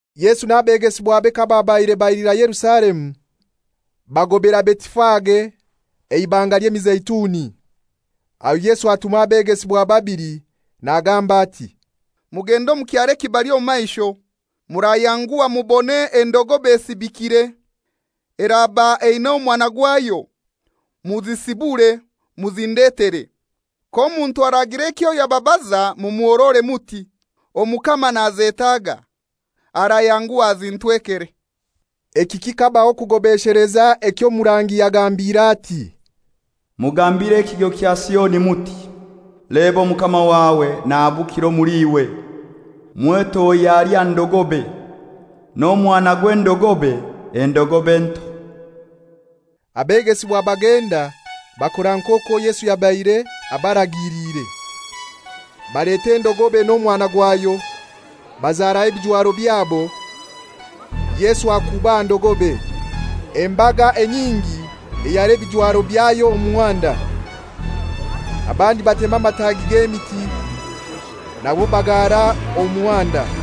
Yesu n'abegesibwabe kababaire bailira Yerusalemu, bagobera Betifage Eibanga ly'Emizeituni. Aho Yesu atuma abegesibwa babili nagamba ati, «Mugende omu kyaro ekibali omu maisho, murayanguha mubone endogobe esibikire, eraba eina omwana gwayo; muzisibure muzindetere. K'omuntu aragira ekyo yababaza mumuhorore muti, ‹Omukama nazetaaga,› arayanguha azintwekere.» Eki kikabaho kugobesheleza eky'omurangi yagambire ati, «Mugambire ekigo kya Sioni muti, Leba, Omukama wawe nahabukira omuli iwe, mwetohya ali aha ndogobe, n'omwana gw'endogobe, endogobe nto.» Abegesibwa bagenda bakora nk'okwo Yesu yabaire abaragiliire. Baleta endogobe n'omwana gwayo, bazaraho ebijwaro byabo, Yesu akuuba aha ndogobe. Embaga enyingi eyara ebijwaro byayo omu muhanda, abandi batema amatagi g'emiti nago bagara omu muhanda.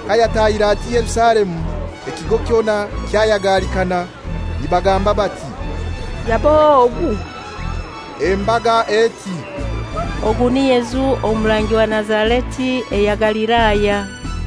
Kayatahire ati Yerusalemu ekigo kyona kyayagalikana, nibagamba bati, «Yab'ohai ogu?» Embaga eti, «Ogu ni Yesu omurangi wa Nazareti eya Galilaya.»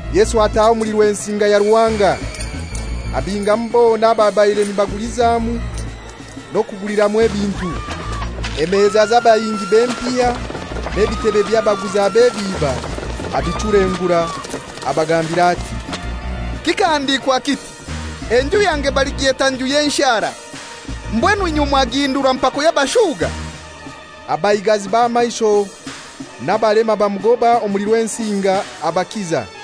Yesu ataha omuli Rwensinga ya Ruhanga, abingamu bona ababaire nibagulizamu n'okuguliramu ebintu. Emeza z'abahingi b'empiha n'ebitebe by'abaguza b'ebiiba abichulengura. Abagambira ati, «Kikahandikwa kiti, ‹Enju yange baligyeta nju y'enshara;› mbwenu inywe mwagihindura mpako y'abashuga.» Abaigazi b'amaisho n'abalema bamugoba omuli Rwensinga, abakiza.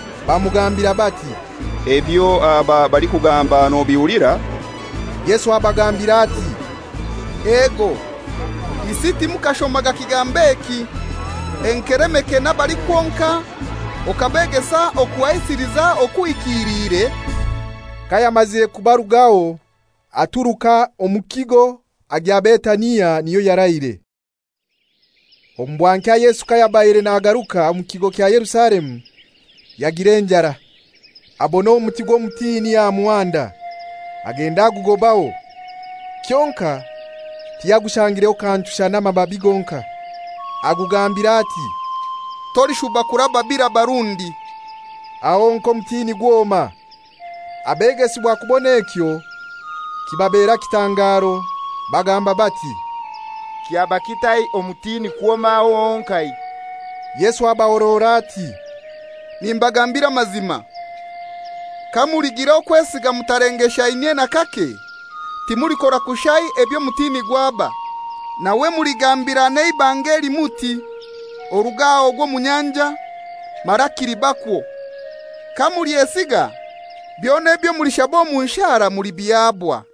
Bamugambira bati, «Ebyo aba balikugamba nobihulira?» Yesu abagambira ati, «Ego, isi timukashomaga kigambo eki, Enkelemeke n'abalikwonka okabegesa okuhaisiliza okuhikiliire?» Kayamazire kubarugaho aturuka omu kigo agya Betania, niyo yaraire. Omu bwankya Yesu kayabaire nagaruka omu kigo kya Yerusalemu, yagira enjara. Abona omuti gw'omutini aha muhanda, agenda agugobaho, kyonkai tiyagushangireho kantu shana amababi gonkai. Agugambira ati, «Tolishuba kuraba biraba rundi!» Aho honkai omutini gwoma. Abegesibwa kubona ekyo kibabera kitangaro; bagamba bati, «Kyaba kitai omutini kwoma aho honkai?» Yesu abahorora ati, «Nimbagambira amazima, kamuligira okwesiga mutalengeshainyie n'akake, timulikora kushai eby'omutini gwaba, nawe muligambira n'eibanga eli muti, ‹Oruge aha ogwe omu nyanja,› mara kilibakwo. Kamulyesiga, byona ebyo mulishaba omu nshara mulibihabwa.»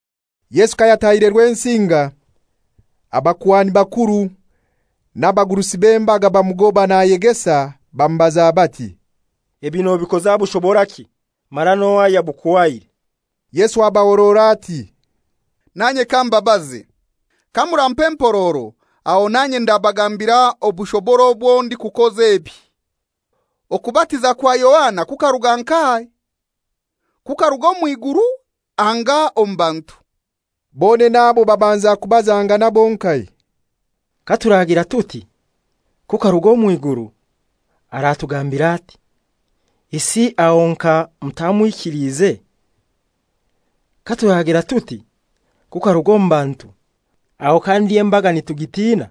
Yesu kayatahire Rwensinga, abakuhani bakuru n'abagurusi b'embaga bamugoba nayegesa, bamubaza bati, «Ebi nobikoza bushoboraki, mara n'ohai ayabukuhaire?» Yesu abahorora ati, «Nanye kambabaze; kamurampa empororo aho nanye ndabagambira obushobora obwo ndikukoza ebi. Okubatiza kwa Yohana kukaruga nkahai? Kukaruga omw'iguru anga omu bantu?» Bonene abo babanza kubazangana bonkai, «Katuragira tuti, ‹Kukaruga omw'iguru,› aratugambira ati, ‹Isi aho nka mutamwikiliize?› Katuragira tuti, ‹Kukaruga omu bantu,› aho kandi embaga nitugitina;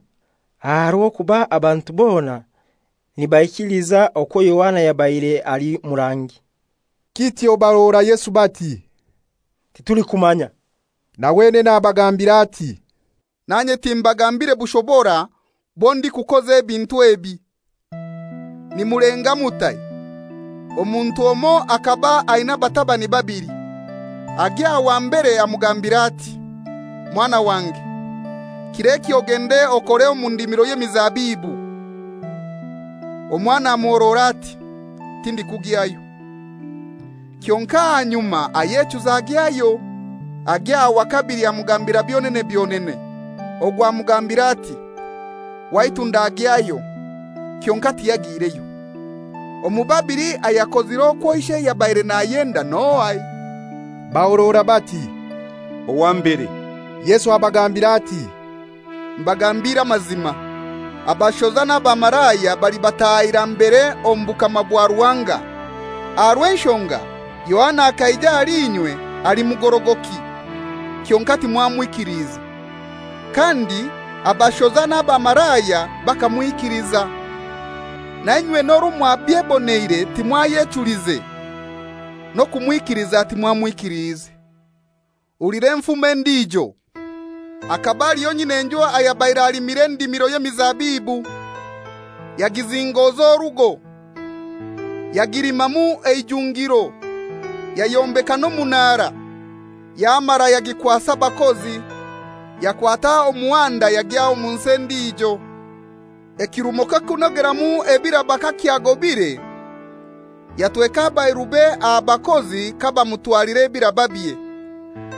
aha rw'okuba abantu bona nibaikiliza okwo Yohana yabaire ali murangi.» Kityo bahorora Yesu bati, «Titulikumanya.» Na wenene abagambira ati, «Nanye timbagambire bushobora bwo ndikukoza ebintu ebi.» «Nimulenga mutai? Omuntu omoi akaba aina abatabani babili. Agya aha wa mbere amugambira ati, ‹Mwana wange, kir'eki ogende okore omu ndimiro y'emizabibu.› Omwana amuhorora ati, ‹Tindikugyayo.› Kyonkai ahanyuma ayechuza agyayo. Agya aha wa kabili amugambira byonene byonene. Ogwo amugambira ati, ‹Waitu ndagyayo,› kyonkai tiyagiireyo. Omu babili ayakozire okwo ishe yabaire nayenda n'ohai?» Bahorora bati, «Owa mbere.» Yesu abagambira ati, «Mbagambiire amazima, abashoza n'abamalaya balibataahira mbere omu bukama bwa Ruhanga. Aha rw'enshonga Yohana akaija ahali inywe ali mugorogoki, kyonkai timwamwikiliize, kandi abashoza n'abamalaya bakamwikiliza. Na inywe n'orwo mwabyeboneire timwayechulize n'okumwikiliza timwamwikiliize.» «Hulira enfumo endijo. Hakaba haliho nyin'enju ayabaire alimire endimiro y'emizabibu; yagizingoza orugo, yagilimamu eijungiro, yayombeka n'omunara, yamara yagikwasa abakozi, yakwata omuhanda yagya omu nsi endijo. Ekirumo ky'okunogeramu ebiraba kakyagobire, yatweka abairube aha bakozi kabamutwalira ebirababye.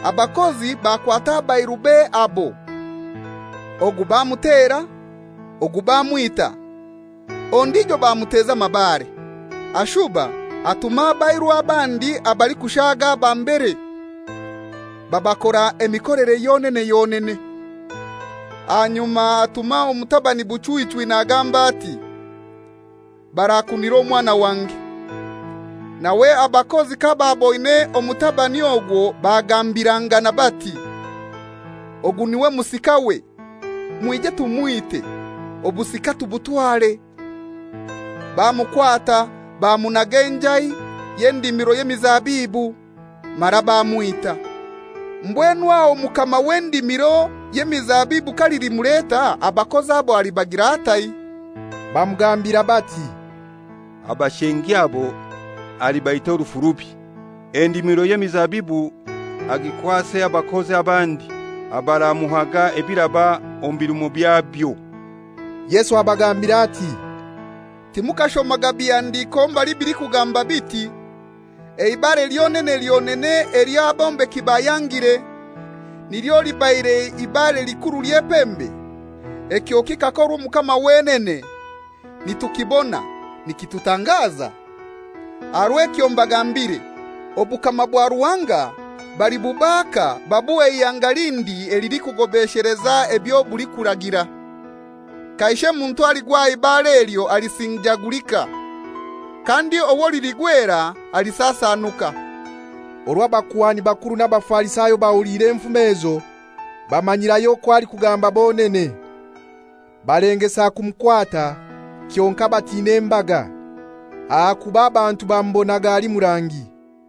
Abakozi bakwata abairube abo, ogu bamutera, ogu bamwita, ondijo bamuteza amabare. Ashuba atuma abairu abandi abalikushaga aba mbere; babakora emikolere yonene yonene. Ahanyuma atuma omutabani buchwichwi, nagamba ati, ‹Barakunira omwana wange.› Nawe abakozi kabaaboine omutabani ogwo bagambirangana bati, ‹Ogu niwe musikawe, mwije tumwite, obusika tubutware.› Bamukwata bamunaga enjai y'endimiro y'emizabibu, mara bamwita. Mbwenu aho mukama w'endimiro y'emizabibu kalilimuleta, abakozi abo alibagira atai?» Bamugambira bati, «Abashengi abo alibaita orufu rubi, endimiro y'emizabibu agikwase abakozi abandi abaramuhaga ebiraba omu birumo byabyo.» Yesu abagambira ati, «Timukashomaga bihandiko mbali bilikugamba biti, ‹Eibare lyonene lyonene elyo abombeki bayangire, nilyo libaire ibare likuru ly'epembe; ekyo kikakorwa omukama wenene, nitukibona, nikitutangaza?›» Aha rw'ekyo mbagambire, obukama bwa Ruhanga balibubaaka babuhe ihanga lindi elilikugobesheleza ebyo bulikuragira. [ Kaishe muntu aligwa aha ibare elyo alisinjagulika, kandi owo liligwera alisasanuka.] Orwo abakuhani bakuru n'Abafarisayo bahuliire enfumoze ezo, bamanyirayo okwo alikugamba bonene. Balengesa kumukwata, kyonkai batina embaga, ahakuba abantu bamubonaga ali murangi.